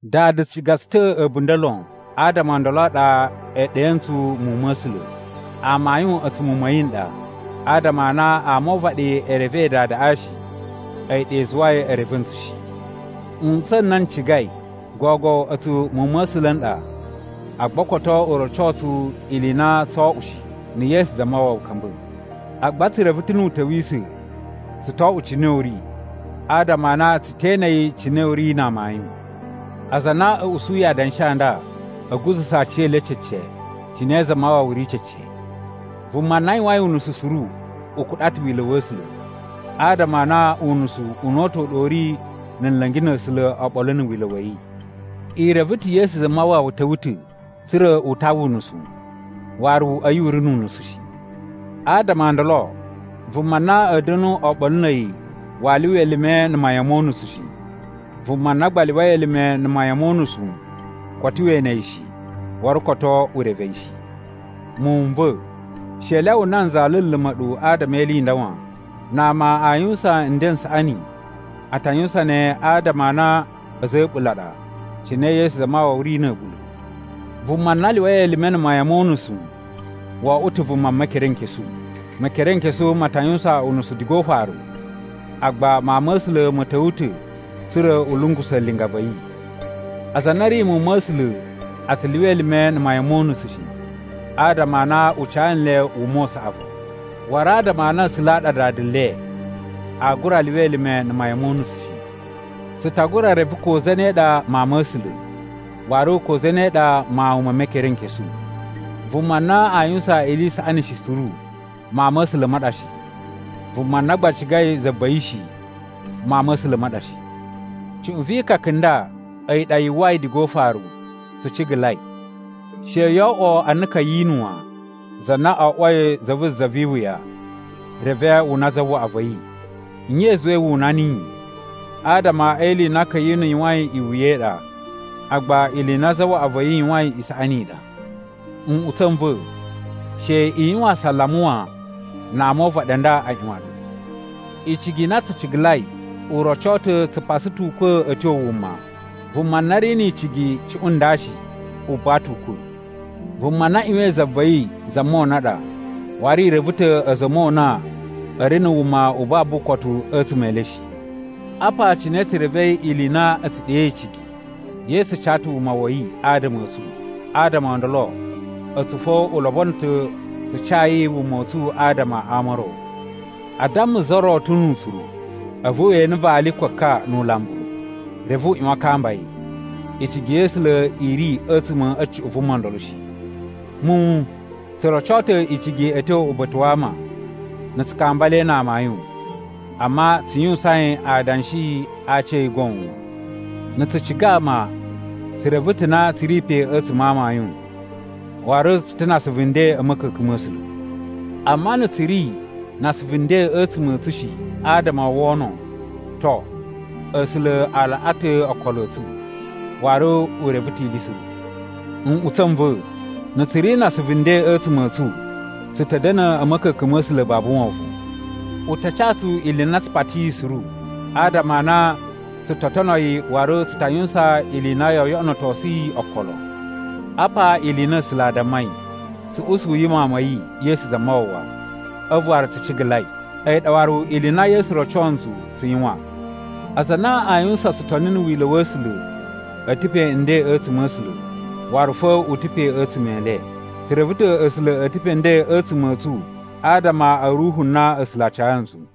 Dada ciga tsu ta̱ a̱bunda̱ lon, adama o ndolo a ɗa e ɗe ntsu muwun ma̱ A̱sula̱. Amayun a̱tsu muwun ma̱ yi n ɗa. Adama a na ama o uvaɗi e revei Dadaꞌa shi, a̱yi ɗa i zuwai e reve ntsu shi. Nꞌutsa̱ n na n cigai, gogo a̱tsu muwun ma̱ A̱sula̱ n ɗa, agba koto u roco tsu ili i na tsoo oꞌwo shi, na̱ Yesu Zamawawa ka̱mba̱. Agba tsu reve ta̱ nu u ta̱wisa̱, tsu to oꞌwo cine u ri, adama a na tsu te ene yi cine u ri na amayun. Aza a na a̱ usuyi adanshi a nda a̱ guza̱sa̱ aciyele cece cine Zamawawa ri cece. Vuma na yuwain unusu suru u kuɗa ta̱ wila̱ wa̱ A̱sula̱, adama a na unusu una̱ta̱ u ɗa u ri na̱ nla̱ngi na̱ A̱sula̱ oɓolo na̱ wila̱ wa̱ yi. I reve ta̱ Yesu Zamawawa ta̱wa̱ ta̱ tsa̱ra̱ u tawa unusu, waru a̱yi u ri nu unusu shi. Adama o ndolo vuma na a̱a̱ da̱nu oɓolo na̱ a̱yi waa lyuwa elime na̱ mayan mo unusu shi. Vuma na gba lyuwai elime na̱ mayan mo unusu koto we ene yi shi waru koto u reve yi shi. Muwun n va̱ she i lyawa nanza luluma̱ ɗu adama e ili i nda wan: na ama a yuwusan nden n saꞌani, a ta yuwusan ne adama a na a̱za̱ a̱ a̱ɓula̱ a ɗa, cine Yesu Zamawawa ri na̱ a̱ɓula̱. Vuma na lyuwai elime na̱ mayan mo unusu wo oꞌwo ta̱ vuma Mekerenkesu. Mekerenkesu ma ta yuwusan unusu diga o ufaru. Agba Mawun ma̱ A̱sula̱ ma̱ ta̱wa̱ ta̱ tsa̱ra̱ u lungusa̱ linga va̱ yi. Aza a na a̱ ri muwun ma̱ A̱sula̱ a tsu lyuwa elime na̱ mayan mo unusu shi, adama a na u ca nle wuma u saꞌavu. Waru adama a na A̱sula̱ a ɗa Dada le, aa gura lyuwa elime na̱ mayan mo unusu shi. Tsu ta gura reve ko zane ɗa mawun ma̱ A̱sula̱, waru ko zane ɗa mawun me Mekerenkesu. Vuma na a yuwusan ili i saꞌani shi suru, mawun ma̱ A̱sula̱ ma ɗa shi. Vuma na gba cigai za va̱ yi shi, mawun ma̱ A̱sula̱ ma ɗa shi. Cuꞌun vi ikaka i nda a̱yi ɗa yu uwwai diga o ufaru: tsu cigalai. She yoo oꞌwo ana Ka̱yinu wan, za na oꞌwoi za vu za vi iwuya reve wu una zawaꞌa va̱ yi. Nye i zuwai wu una niyi? Adama e ili i na Ka̱yinu yuwain iwuya i ɗa, agba ili i na zawaꞌa va̱ yi yuwain isaꞌani i ɗa. Nꞌutsa̱ n va̱, she i yuwan asalama wan na ama o uvaɗi a nda a ꞌyuwan nɗu. Icigi i na tsu cigalai u roco ta̱ tsu pasa ta̱ ukwa̱ a̱ tyo wuma. Vuma na ri ni icigi cuꞌun nda shi, u buwa ta̱ ukwa̱. Vuma na ꞌyuwain za va̱ yi za mona ɗa, waru i reve ta̱ a̱za̱ a̱ mona a̱ ri na̱ wuma u babu ukotu a̱tsuma̱ e le shi. Apa cine tsu revei ili i na a̱ tsu ɗe icigi: Yesu ca ta̱ wuma wa̱ yi adama a̱ tsu. Adama o ndolo a̱tsu fo u lobono ta̱ tsu cayi wuma u tsu adama a ama o ro! A damma za ro ta̱ nu utsuru a̱vu we ene vali ko ka nu ulambu, reve u ꞌyuwan a kamba yi. Icigi ya̱ A̱sula̱ i ri a̱tsuma̱ a̱ cuꞌun vuma ndolo shi. Muwun, tsu roco ta̱ icigi a̱ tyo uba̱ta̱ wa ama, na̱ tsu kamba le na amayun, amma tsu yuwusain adanshi a aci a̱ yi goon wan. Na̱ tsu ciga ama, tsu reve ta̱ na tsu ri pe a̱tsuma̱ a amayun, waru tsu ta̱ na asuvu nden a̱ ma̱ka̱ka̱n ma̱ A̱sula̱. Amma na̱ tsu ri na asuvu nden a̱tsuma̱ a̱ tsu shi adama o wono, to, A̱sula̱ a laꞌa ta̱ okolo a̱ tsu, waru u reve ta̱ ili suru. Nꞌutsa̱ n va̱, na̱ tsu ri na asuvu nden a̱tsuma̱ a̱ tsu, tsu ta̱ da̱na̱ a̱ ma̱ka̱ka̱n ma̱ A̱sula̱ babu wovon. U ta ca tsu ili i na tsu patiyi suru, adama a na tsu to tono yi waru tsu ta yuwusan ili i na yoo yoꞌonotosu yi okolo. Apa ili i na A̱sula̱ a dammai: tsu usuyi Mawun ma̱ yi, Yesu Zamawawa, a̱vu waru tsu cigalai. A̱yi ɗa waru ili i na Yesu roco ntsu tsu yuwan. Aza a na aa yuwusan tsutoni na̱ wila̱ wa̱ A̱sula̱, a̱ ta̱ pe nden a̱tsuma̱ a̱ A̱sula̱, waru fo u ta̱ pe a̱tsuma̱ e le. Tsu reve ta̱ A̱sula̱ a̱ ta̱ pe nden a̱tsuma̱ a̱ tsu adama a̱ Ruhu na A̱sula̱ a ca ntsu.